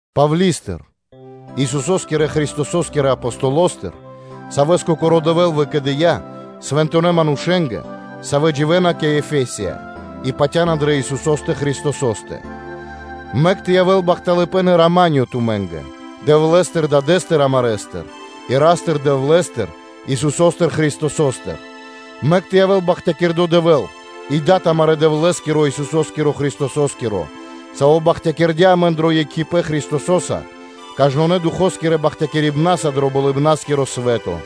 Павли́стыр, Исусо́скирэ Христосо́скирэ Апостолостыр, савэ́с Кокоро́ Дэвэ́л выкэдыя́, Свэнтонэ́ манушэ́нгэ, савэ́ дживэ́на кэ Эфе́со, и патя́на дрэ Исусо́стэ Христосо́стэ: Мэк тэ явэ́л бахталыпэ́н и рама́нё (миро) тумэ́нгэ Дэвлэ́стыр Дадэ́стыр амарэстыр, и Ра́стыр-Дэвлэ́стыр, Исусо́стыр Христосостыр. Мэк тэ явэ́л бахтякирдо́ Дэвэ́л и Дад амарэ́ Дэвлэ́скиро Исусо́скиро Христосо́скиро, Саво́ бахтякирдя́ амэн дро екхипэ́н Христоса кажнонэ́ Духо́скирэ бахтякирибна́са дро Болыбна́скиро свэ́то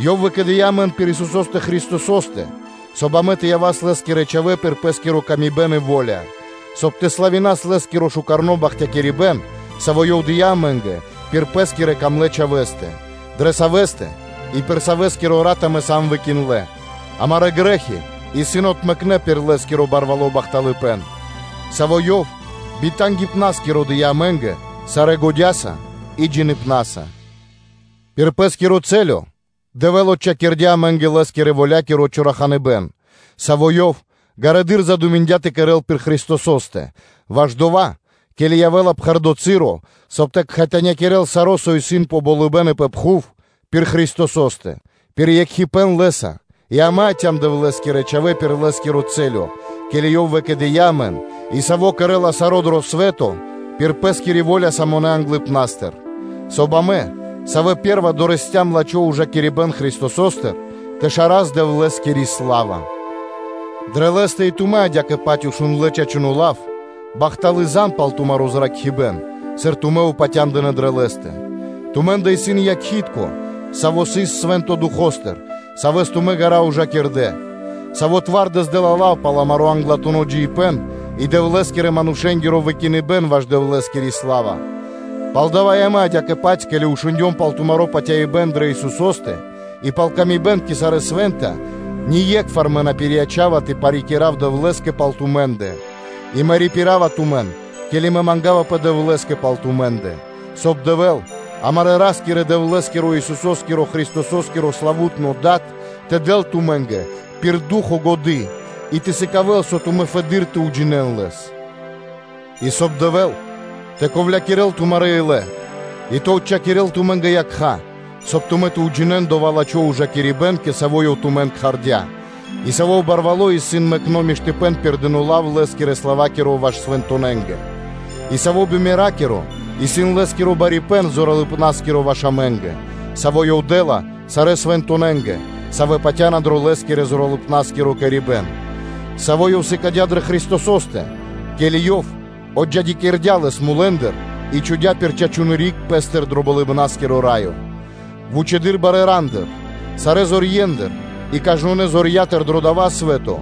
Ёв выкэдыя́ амэн пир Исусо́стэ Христосо́стэ, соб (кай) амэ тэ явас Лэ́скирэ чхавэ́ пир Пэ́скиро выкэдыибэн и во́ля, соб (кай) тэ славинас Лэ́скиро шука́р бахталыпэ́н, саво́ Ёв дыя́ амэ́нгэ пир Пэ́скирэ Дрогонэ́ Чхавэ́стэ: дрэ Савэ́стэ и пир Савэскиро Рат амэ сам выкиндлэ (выракхнэ), амарэ́ грэ́хи исын отмэкнэ пир Лэ́скиро барвало́ бахталыпэ́н; Саво́ Ёв би тангипнаскиро дыя́ амэ́нгэ сарэ́ годя́са и джиныбнаса, пир Пэ́скиро цэлё/рэс (чачипэ́н) Дэвэ́л отчхакирдя́ амэ́нгэ Лэ́скирэ-воля́киро чораханыбэн, саво́ Ёв ґарэдыр задуминдя тэ кэрэ́л пир Христосо́стэ, ваш дова́, ке́ли явэ́ла пхэрдо́ часо, соб (кай) тэ кхэтанякирэл саро́, со исын пэ болыбэ́н и пэ пхув, пир Христосо́стэ, пир екхипэ́н Лэ́са и амэ яця́м Дэвлэ́скирэ манушэ́нца пир Лэ́скири мысля, ке́ли Ёв выкэдыя́ амэн и Саво́ кэрэ́ла саро́ дро свэ́то пир Пэ́скири во́ля самонэ англыпна́стыр, соб (кай) амэ, савэ́ пэ́рва дорэсцям (долыям) лачхо́ ужакирибэ́н Христосостыр, тэ шарас Дэвлэ́скири сла́ва; дрэ Лэ́стэ и тумэ́ адя́кэ-паць шундлэ́ чачуно́ лав, бахталы́ зан (звесь) пал тумаро́ зракхибэ́н, сыр тумэ́ упатя́ндынэ дрэ Лэ́стэ. Тумэ́ндэ исын якхи́тко (печать), саво́ сыс Свэнтонэ́ Духо́стыр, Савэс тумэ́ ґара́ ужакирдэ, Саво́ дэ́ла лав сыр сымады́ (залого) пал амаро́ англатуно́ джиибэ́н и Дэвлэ́скирэ-манушэ́нгиро выракхибэн ваш Дэвлэ́скири сла́ва. Палдава́ и мэ адя́кэ-паць, ке́ли амэ шундём пал тумаро́ патяибэ́н дрэ Исусо́стэ и пал ла́ска кэ сарэ́ свэ́нта, ние́кхвар мэ на пириячава тэ парикира́в Дэвлэ́скэ пал тумэ́ндэ, и мэ рипирава тумэн, ке́ли мэ мангавапэ Дэвлэ́скэ пал тумэ́ндэ, соб (кай) Дэвэ́л амарэ́ Ра́скирэ-Дэвлэ́скиро, Исусо́скиро Христосо́скиро, славу́тно Дад, тэ дэл тумэ́нгэ пир Ду́хо (Фа́но) годы́ и тэ сыкавэ́л, соб (кай) тумэ́ фэды́р тэ уджинэ́н Лэс, и соб (кай) Дэвэ́л тэ ковлякирэл тумарэ́ илэ и тэ отчхакирэл тумэ́нгэ якха́, соб (кай) тумэ́ тэ уджинэ́н дова́ лачхо́ ужакирибэ́н, кэ саво́ Ёв тумэн кхардя́, и саво́ барвало́ исын мэкно́ миштыпэ́н пир дыно́ лав, Лэ́скирэ славакиро, ваш свэнтонэнгэ, и саво́ бимеракиро исын Лэ́скиро барипэ́н зоралыпнаскиро ваш амэ́нгэ, саво́ Ёв дэ́ла сарэ́ свэнтонэнгэ, савэ́ патя́на дро Лэ́скирэ-зоралыпнаскиро кэрибэн, Саво́ Ёв сыкадя́ дрэ Христосо́стэ, ке́ли Ёв отджидякирдя́ Лэс мулэ́ндыр и чхудя́ пир чачуны́ риг Пэ́стыр дро Болыбна́скиро Раё, вучэды́р барэ́ рандыр, сарэ́ зорьендыр и кажнонэ́ зорья́тыр дро дава́ свэ́то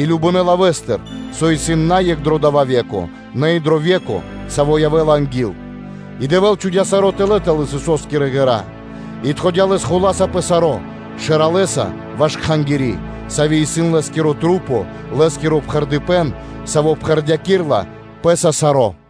и кажнонэ́ лавэ́стыр, со исын на екх дро дава́ ве́ко, нэ и дро ве́ко, саво́ анги́л явэ́ла; и Дэвэ́л чхудя́ саро́ тэлэ́ тэл Исусо́скирэ ґэра́, и чхудя́ Лэ́скэ зор тэ явэ́л Шэрэ́ Хула́са пэ саро́, Шэралэса ваш Кхангири́. Сави́ исын Лэ́скирэ маса́, Лэ́скиро пхэрдыпэн, Саво́ пхэрдякирэла Пэ́са саро́.